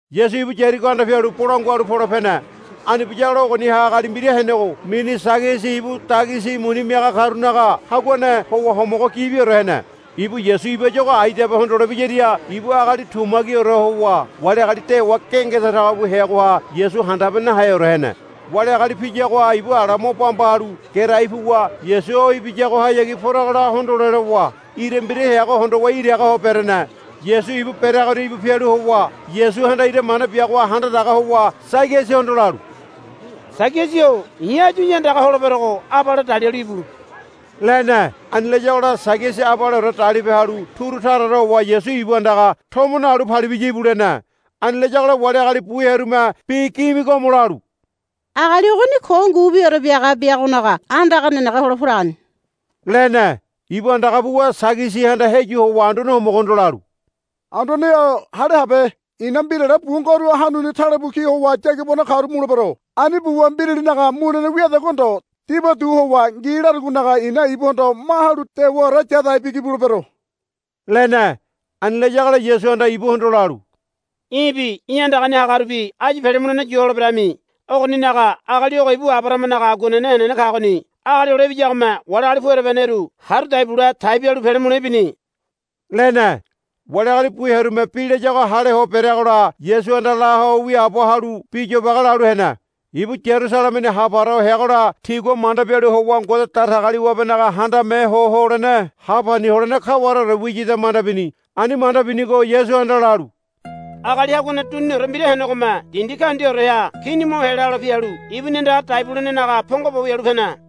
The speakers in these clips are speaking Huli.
Yasu ibu Yarigo anda pialu bolangua halu pole pene. Ani biyagola ogoniha agali mbira henego mini Sagiasi ibu dagisi muni miaga karunaga haguane howa homogo gibiore hene. Ibu Yasu ibayuago aidabe hondole biyaria ibu agali tumagiore howa wali agali dewa gengeda tago bu heagoha Yasu handabe naheore hene. Wali agali piyagoha ibu ala mo bamba halu gerai puwa Yasu o ibiyagohayagi poragola hondole lowa ira mbira heago hondowa iraga ho berene. Yasu ibu bereagoria íbu pialu howa Yasuhanda ira mane biagoha handa daga howa Sagiasihondo lalu, Sagiasi-o i̱ áyu í̠ andaga holeberogo abale dalialu íbu, lene. Ani layagola Sagiasi abaleore dalipe halu turu taraore howa Yasu ibu andaga, Tomo nalu palibiya íbu, lene. Ani layagola wali agali bu hearume bi gimigomo lalu, Agali ogoni ko ngubiore biaga biagonaga andaga nenege hole poragoni, lene. Ibu andaga puwa Sagiasihanda heyu howa Anduane Homogohondo lalu, Anduane-o hale habe. I̱na mbirale bu ngoru hanuni talebu ki howa yagibano karu mulebero. Ani buwa mbiralinaga mulene wiadagua ndo dibaudu howa ngi larugonaga i̱na ibuhondo ma halu dewaore yadai bigi bulebero, lene. Ani layagola Yasuhanda ibuhondo lalu, Í̠bi í̠ andagani hagarubi áyu pele mulene yu holeberami. Ogoninaga agali ogo ibu Abarahamanaga aguanene henene kagoni. Agali Hole Ibiyagome wali agali pu ereba heneru haru dai bule tai bialu pele mule ibini, lene. Wali agali bu hearume bi layago hale ho bereagola Yasuhanda la ho wiaabo halu bi yobage lalu hene. Ibu Yarusalemeni ha para ho heagola tigua manda bialu howa Ngode Datagaliwabenaga Handame Ho Holene ha pani holene kawareore wiyada manda bini. Ani manda binigo Yasuhanda lalu, Agali haguane duniniore mbira henegome dindi kaundiaoreha kini mo helelo pialu ibuni andaga dai bulenenaga pongo bo wialu pene.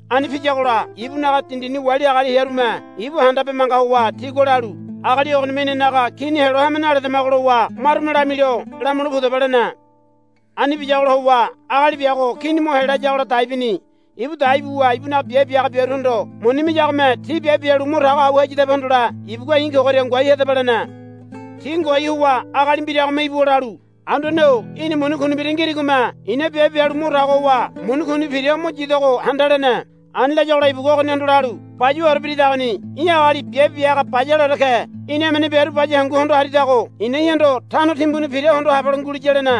Ani piyagola ibunaga dindini wali agali hearume ibu handabe manga howa tigua lalu, Agali ogonime inanaga kini helo hame naledamago, lowa marume lamilo, Lamule pudaba, lene. Ani biyagola howa agali biago kini mo helayagola dai bini. Ibu dai buwa ibunaga biabe bia haga biaruhondo muni miyagome ti biabe bialu mo tago au hayadabe hondole ibugua, I̱ kogoria ngoai hadaba, lene. Ti ngoai howa agali mbiragome ibuwa lalu, Anduane-o í̠na muni kuni mbira ngirigome i̱na biabe bialu mo tago howa muni kuni pira o mo yidogo handa, lene. Ani layagola ibugua ogonihondo lalu, Bayuwaore biridagoni í̠ agali biabe bia haga bayaleore ke. Í̠na emene biaru baya hangu hondo haridago i̱na í̠hondo tano timbuni pira hondo habelo nguliya, lene.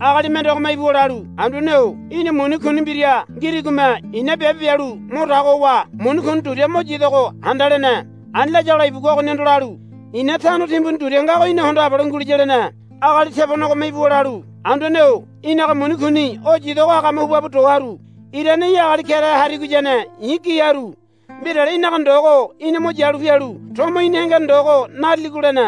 Agali mendegome ibuwa lalu, Anduane-o í̠na muni kuni mbira ngirigome i̱na biabe bialu mo tago howa muni kuni duria mo yidogo handa, lene. Ani layagola ibugua ogonihondo lalu, I̱na tano timbuni duria ngago í̠na hondo habelo nguliya, lene. Agali tebonegome ibuwa lalu, Anduane-o í̠naga muni kuni o yidogo agame huba bu do haru. Irane í̠ agali kerahe harigoyane i̱ gi haru. Mbirale í̠naga ndogo í̠na mo yalu pialu tomo í̠ni hengene ndogo nariligo, lene.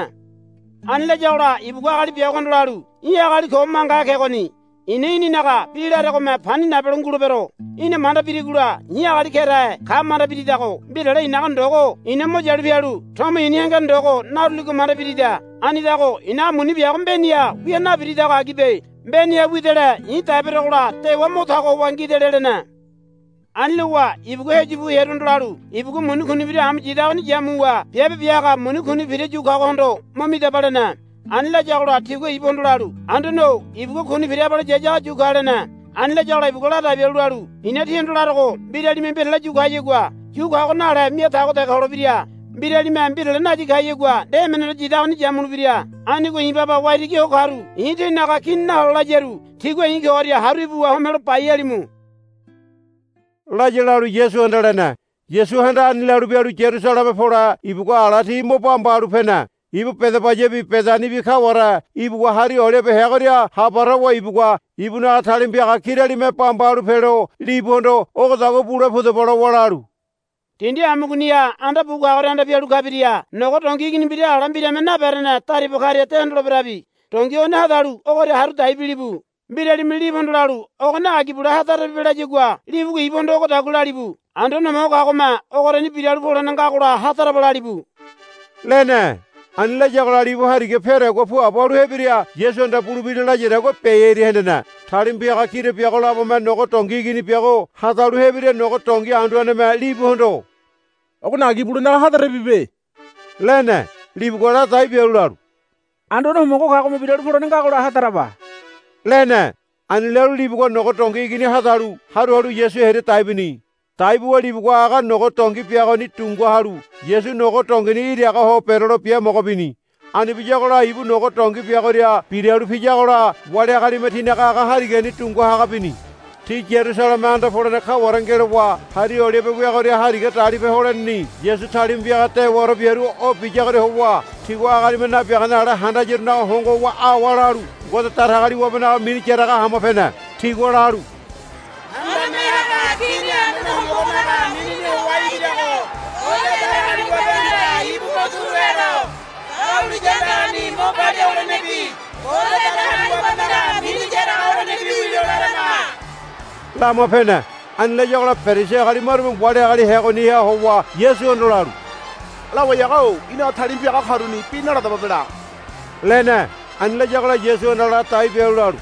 Ani layagola ibugua agali biagohondo lalu, Í̠ agali ko mangahe kegoni. I̱na í̠ninaga bi laregome pani nabelo ngulebero. Í̠na manda birigola i̱ agali kerahe ka manda biridago mbirale i̱naga ndogo i̱na mo yalu pialu tomo i̱ni hengene ndogo naruligo manda birida. Anidago i̱naga muni biago mbeniha wia nabiridago agibe. Mbeniha widele i̱ dai berogola dewa mo tago howa ngidele, lene. Ani lowa ibugua heyu bu hearuhondo lalu, Ibugua muni kuni mbira amu yidagoni yamuwa biabe bia haga muni kuni pira yu kagohondo mo midaba, lene. Ani layagola tigua ibuhondo lalu, Anduane-o ibugua kuni pira abale yayago yu ka, lene. Ani layagola ibugua ladai bialu lalu, I̱na tíhondo larogo mbiralime mbirale yu kayagua yu kago nale mia tago dege holebira. Mbiralime mbirale nayi kayagua nde emeneore yidagoni yamulebira. Anigo i̱ baba waitigi ho karu i̱ tinaga kini nahole layaru tígua i̱ kogoria haru ibuwa homelo bai halimu, laya lalu Yasuhanda lene. Yasuhanda ani lalu bialu Yarusaleme pole ibugua ala ti mo bamba halu pene. Ibu Bedabayabi Bedanibi kaware ibuwa Hari Olibe heagoria ha para howa ibugua ibunaga talima piaga kiralime bamba halu pelo libuhondo, Ogodagua bule pudaba, lowa lalu, Dindi amugoniha anda bu kagoria anda pialu kabiria nogo dongi igini mbira ala mbirame naberene dariba karia de hondoleberabi. Dongi ogoni hadalu ogoria haru dai bilibu. Mbiralime libuhondo lalu, Ogoni agi bule hadarabibe, layagua libugua ibuhondo ogodagua lalibu, Anduane Homogo kagome ogoriani biralu polene ngagola hadaraba, lalibu, lene. Ani layagola libu hariga peadagua puabo halu hebiria Yasuhanda bulebira layadagua biai hearia hendene. Talima piaga kira biago labome nogo dongi igini biago hadalu hebiria nogo dongi anduaneme libuhondo, Ogoni agi bulenaga hadarabibe, lene. Libugua ladai bialu lalu, Anduane Homogo kagome biralu polene ngagola hadaraba, lene. Ani lalu libugua nogo dongi igini hadalu haru halu Yasu hearia dai bini. Dai buwa libugua aga nogo dongi biagoni dunga halu Yasu nogo dongini iraga ho berelo biamogo bini. Ani biyagola ibu nogo dongi biagoria biralu piyagola wali agalime tinaga aga harigani dunga haga bini. Ti Yarusaleme anda polene kaware ngelowa Hari Olibe weagoria hariga dalipe holeneni Yasu talima piaga dewaore biaru o biyagoria howa tigua agalime nabiagane ale handayarunaga hongo howa awa lalu Ngode Datagaliwabenaga mini yaraga hama pene. Tigua lalu, Handame Haga Kini Anduane Homogonaga minini howa ibirago Ngode Datagaliwabehanda ibu mo turu helo. Dahuliya andagani mo palia holenebi Ngode Datagaliwabenaga mini yaraga holenebi wilo larama, lama pene. Ani layagola Perisi agali marume wali agali heagoniha howa Yasuhondo lalu, Lawai haga-o í̠naga talima piaga karuni bi naladababe la, lene. Ani layagola Yasuhanda ladai bialu lalu,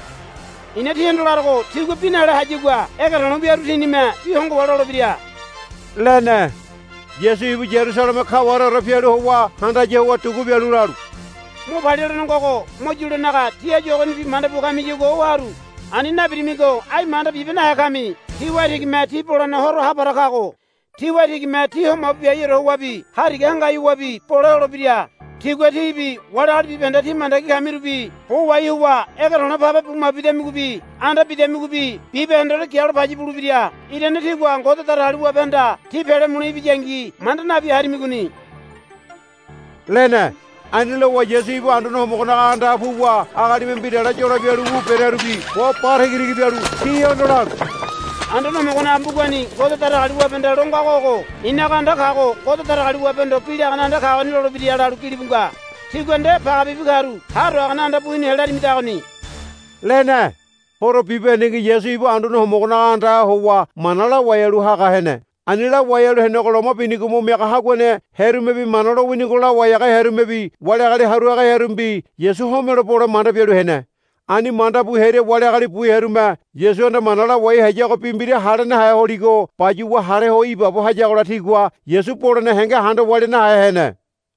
I̱na tíhondo larogo tigua bi nale hayagua ege to̱le̱ wiaru tinime bi hongo howa lolebira, lene. Yasu ibu Yarusaleme kawareore pialu howa handaya howa dugu bialu lalu, Mo palia holene ngogo mo yulenaga tí áyu ogonibi manda bua kamiyagua o haru. Ani nabirimigo ai manda bibe nahe kami. Tí waitigime tí bolene horo ha para kago. Tí waitigime tí ho mabu biaiore howabi hariga hangai howabi bole holebira. Tigua tíbi wali agali bibahende tí mandagi kamirubi bo wahai howa ege to̱le̱ pabe bu mabu bidamigobi anda bidamigobi bibahendeore gialo paya bulebira. Irane tígua Ngode Datagaliwabehanda tí pele mule ibiyangi manda nabi harimigoni, lene. Ani lowa Yasu ibu Anduane Homogonaga andaha puwa agalime mbirale yolo bialu wu berearubi bo ba tagitagi bialu tihondo lalu, Anduane Homogonaga mbugani Ngode Datagaliwabehanda lo ngago ogo, I̱naga anda kago Ngode Datagaliwabehondo bi lagane anda kagoni lolebira, lalu gilibu nga. Tígua nde pagebibi karu ha do hagane anda bu hinu helarimidagoni, lene. Horo bibahendengi Yasu ibu Anduane Homogonaga andaha howa mana lawai halu haga hene. Ani lawai halu henego loma binigo mo miaga haguane hearumebi Mana lowinigo lawai haga hearumebi wali agali haru haga hearumebi Yasu homelo bole manda bialu hene. Ani manda bu hearia wali agali bu hearume Yasuhanda mana lawai hayago bi mbira hale nahe holigo bayuwa hale ho ibaabo hayagola tigua Yasu bolene henge handa walia nahe hene.